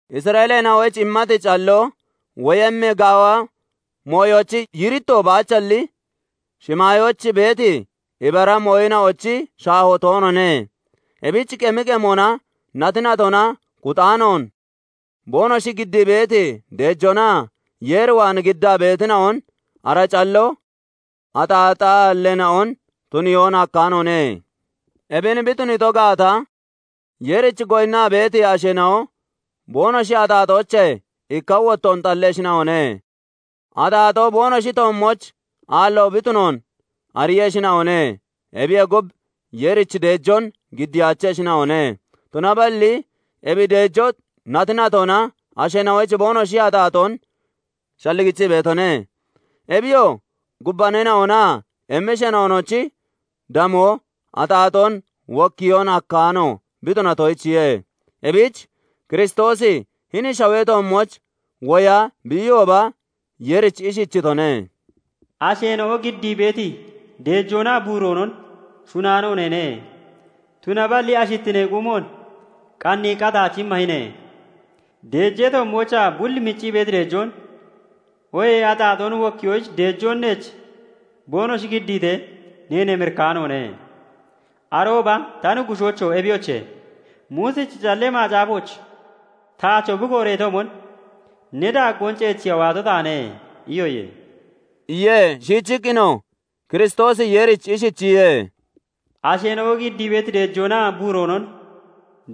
Isra'eeleena'oyich immati calloo woyemmi gaawa mooyochi yiiritto baachalli, shimaayooch beeti ibara mooyina'ochi shaahoo toonoone. Ebich qemi qemonaa nati natona kuxaanoon boonoshi giddii beeti deejoona Yeer waan giddaa beetina'on ara calloo axaaxaalleena'on tuniyoon hakkaanoone. Ebin bi tuniito gaata, Yeerich goyinnaa beeti asheena'o boonoshi axaaxoochee ikka wottoon xalleshina'one; axaaxoo boonoshi toommooch aallo bi tunoon ariiyeshina'one; ebiyee gub, Yeerich deejoon giddiyaacheshina'one. Tunaballi ebi deejoo nati natona asheena'oyich boonoshi axaaxoon shalligichii beetone. Ebiyoo, gubbaneena'onaa emmisheena'onochi damoo axaaxoon wokkiyoon hakkaano bi tunatoyichiye. Ebich Kiristoosi hini shawee toommooch woya bi iyooba Yeerich ishichitone:- "Asheena'o giddii beeti deejoonaa buuroonon shunaano neene; Tunaballi ashittinee quumoon qanniiqqa taach immahine; Deejee toommoochaa bul miccii beeti deejoon, Oohee axaaxoon wokkiyoyich deejoon neech boonoshi giddiitee neen emirikkaanoone. Arooba 'Ta Nuggushoocho! Ebiyoche, Muusichi Callee Macaafooch taacho bi kooreetoomon, Ne daaggoon ceechiya waato taane' iyoye" iye. Shiichiqqinoo Kiristoosi Yeerich ishichiye:- "Asheena'o giddii beeti deejoonaa buuroonon,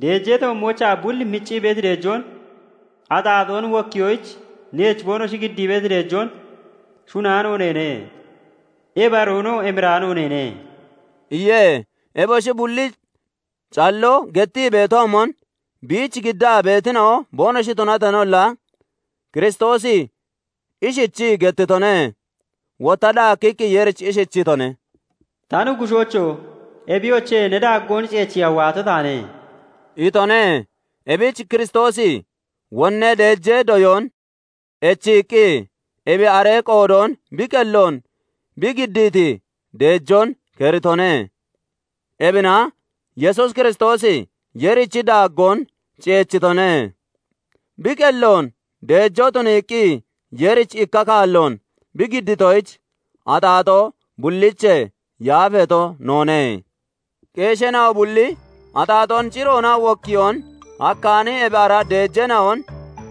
deejee toommoochaa bul miccii beeti deejoon, axaaxoon wokkiyoyich neech boonoshi giddii beeti deejoon shunaano neene; ebi aroonoo emiraano neene" iye. Eboshi bulli calloo gettii beetoomon biich giddaa beetina'o boonoshi tunateenolla, Kiristoosi ishichii gettitone. Wotta daakkiqqi Yeerich ishichitone:- "Ta Nuggushoocho! Ebiyoche, ne daaggoon ceechiya waato taane" itone. Ebich Kiristoosi wonnee deejee doyoon echiiqqi, ebi aree qoodoon bi qelloon bi giddiiti deejoon keritone. Ebina Yesuus Kiristoosi Yeerichi daaggoon ceechitone. Bi qelloon deejoo tuniiqqi Yeerich ikka kaalloon bi giddiitoyich, axaaxoo bulliichee yaafeeto noone. Qeesheena'o bulli axaaxoon ciroona wokkiyoon hakkaani ebi ara deejeena'on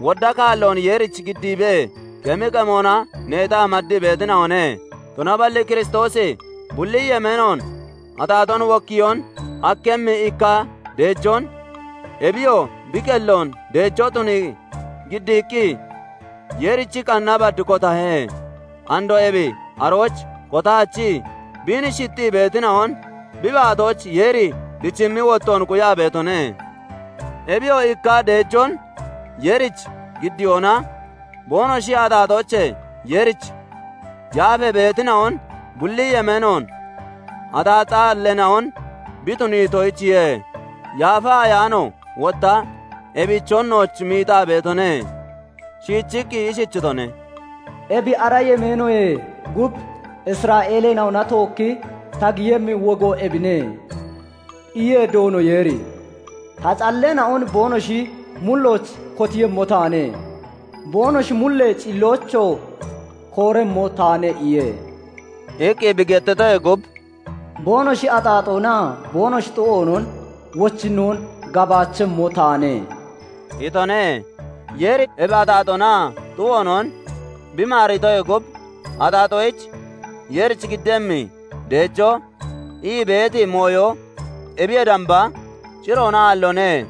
wodda kaalloon Yeerich giddiibee qemi qemona neexaa maddii beetina'one; tunaballi Kiristoosi bulli yemeenoon axaaxoon wokkiyoon hakkemmi ikka deejoon, ebiyoo bi qelloon deejoo tunii giddiiqqi, Yeerichi qanna bad kotahe; andoo ebi arooch kotaachii, biin shixxii beetina'on bi baatooch Yeeri dichimmi wottoon quyaa beetone; Ebiyoo, ikka deejoon Yeerich giddiyoona boonoshi axaaxoochee Yeerich yaafee beetina'on bulli yemeenoon axaaxaalleena'on bi tuniitoyichiye. Yaafa Ayaano wotta ebichon nooch miixaa beetone; shiichiqqi ishichitone:- " 'Ebi ara yemeenoyee gub Isra'eeleena'ona tookki ta giyemmi wogo ebine' iye Doono Yeeri; 'Ta calleena'on boonoshi mullooch kotiiyemmo taane; Boonoshi mullee cilloochoo kooremmo taane' iye" iqqi bi gettitoyee gub, "Boonoshi axaaxoonaa boonoshi xu'oonon wochinnoon gabaachemmo taane" itone. Yeeri ebi axaaxoonaa xu'oonon bi maaritoyee gub, axaaxoyich Yeerich giddemmi, deejoo ii beeti mooyo ebiyee damba ciroona aalloone.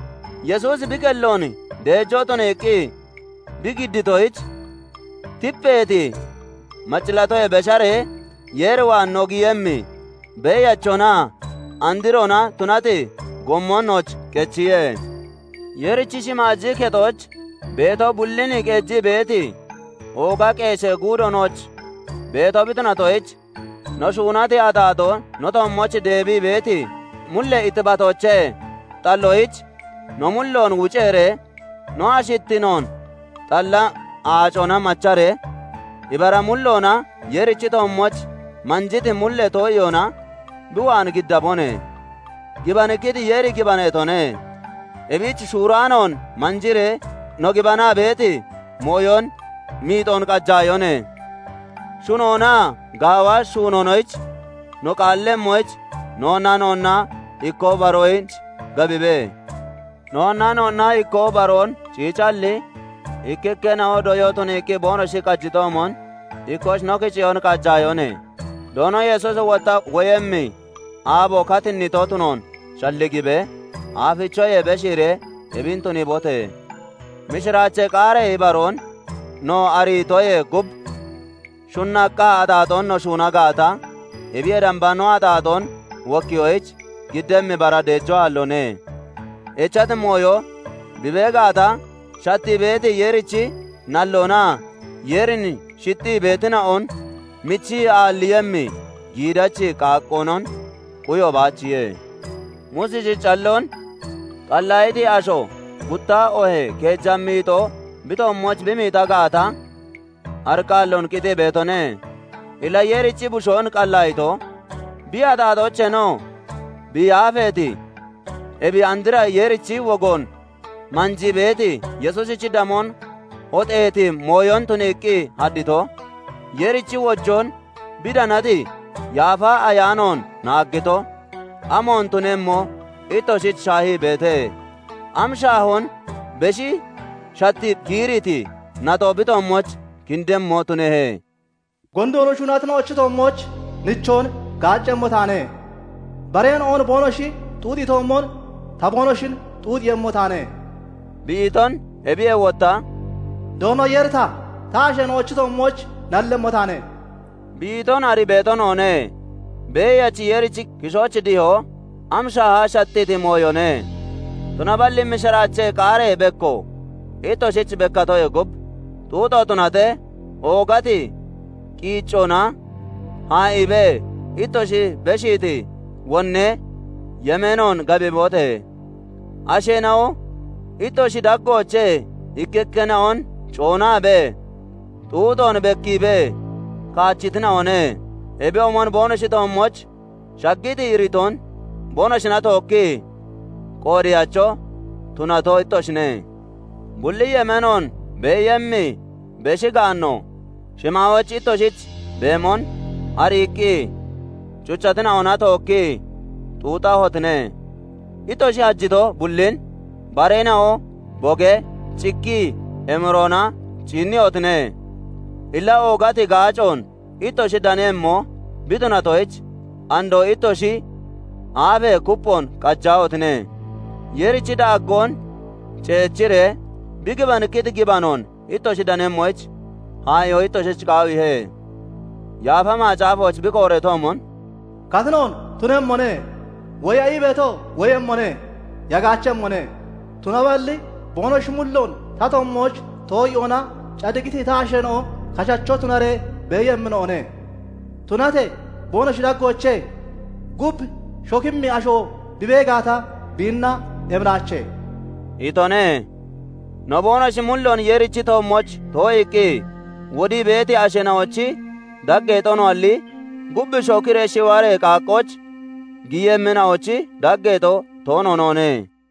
Yesuusi bi qelloon deejoo tuniiqqi bi giddiitoyich, tipeeti macillaatoyee besharee Yeer waan no giyemmi beeyachonaa androona tunati gommon nooch qechiye. Yeerichi shimaaji kexooch beeto bullin qeejii beeti, ooga qeeshee guudo nooch beeto bi tunatoyich, no shuunati axaaxoo no toommooch deebii beeti mullee ittibatoochee xalloyich no mulloon wuceeree, no ashittinoon xalla aacona macharee, ibara mulloona Yeerichi toommooch manjiti mullee too'iyoona bi waan giddabone. Gibanikkiti Yeeri gibaneetone; ebich shuuraanoon manjiree no gibanaa beeti mooyon miixoon qajaayone. Shunoonaa gaawa shuunoonoyich no qaallemmoyich noonnaa noonna ikkoo baroyich gabibe. Noonnaa noonna ikkoo baroon ciicalli, ikkikkeena'o doyoo tuniiqqi boonoshi qajitoomon, ikkooch no kiceyoon qajaayone; Doono Yesuusi wotta woyemmi aabo katinnito tunoon shalligibee aafichoyee beshiiree ebin tuniibote! Mishiraachee qaaree ibaroon no ariitoyee gub, shunnaqqa axaaxoon no shuuna gaata, ebiyee damba no axaaxoon wokkiyoyich giddemmi bara deejoo aalloone. Echati mooyo bi bee gaata, shattii beeti Yeerichi nalloonaa Yeerin shixxii beetina'on michi aalliiyemmi giidachi qaaqqoonon quyo baachiye. Muusichi calloon qallaayiti asho gutta oohee keeja miixoo bi toommooch bi miixa gaata, ariqqaalloon qitii beetone. Illa Yeerichi Bushoon qallaayito, bi axaaxoocheenoo bi yaafeeti, ebi andra Yeerichi wogoon manjii beeti Yesuusichi damoon hoxeeti mooyoomon tuniiqqi haddito, Yeerichi wojoon bi danati Yaafa Ayaanoon naaggito, amoon tunemmo ittoshich shaahii beete? Am shaahoon beshi shattii, giiriiti naxo bi toommooch kindemmo tunehe? "Gondoon shuunatina'ochi toommooch nichoon gaaccemmo taane; bareena'on boonoshi xuuxiitoomon, ta boonoshin xuuxiiyemmo taane" bi iton, ebiyee wotta "Doono Yeeri ta, ta asheena'ochi toommooch nallemmo taane" bi iton arii beeto noone. Beeyachi Yeerichi kishooch dihoo am shaaha shattiiti mooyone! Tunaballi mishiraachee qaaree bekko ittoshich bekkatoyee gub, xuuxo tunatee oogati qiiccoona haa'iibee ittoshi beshiiti wonnee yemeenoon gabibote! Asheena'o ittoshi daggoochee ikkikkeena'on coonaabee, xuuxoon bekkiibee kaachitina'one; ebiyoomon boonoshi toommooch shaggiti iritoon boonoshina tookkii qoodeyacho tunato ittoshine. Bulli yemeenoon beeyemmi beshi gaanno shimaayooch ittoshich beemon ariiqqi cuchatina'ona tookkii xuuxahotine; ittoshi hajito bullin bareena'o bogee, cikkii emiroona ciinniyotine. Illa oogati gaacoon ittoshich daniiyemmo bi tunatoyich, andoo ittoshi aafee kupphoon qajaahotine! Yeerichi daaggoon ceechiree bi gibanikkiti gibanoon ittoshi danemmoyich haa'iyoo ittoshich qaawiihe. Yaafa Macaafooch bi kooreetoomon, "Katinoon tunemmone; woya ii beeto woyemmone; yagaachemmone; Tunaballi boonoshi mulloon ta toommooch too'iyoona cadiqiti ta asheena'o kashacho tunaree beeyemmina'one; Tunatee boonoshi daggoochee gub shokemmi asho bi bee gaata, biinna emiraache" itone. No, boonoshi mulloon Yeerichi toommooch too'iiqqi wodii beeti asheena'ochi daggeexo noalli, gub shokiree shiwaree qaaqqooch giyemmina'ochi daggeexo toono noone.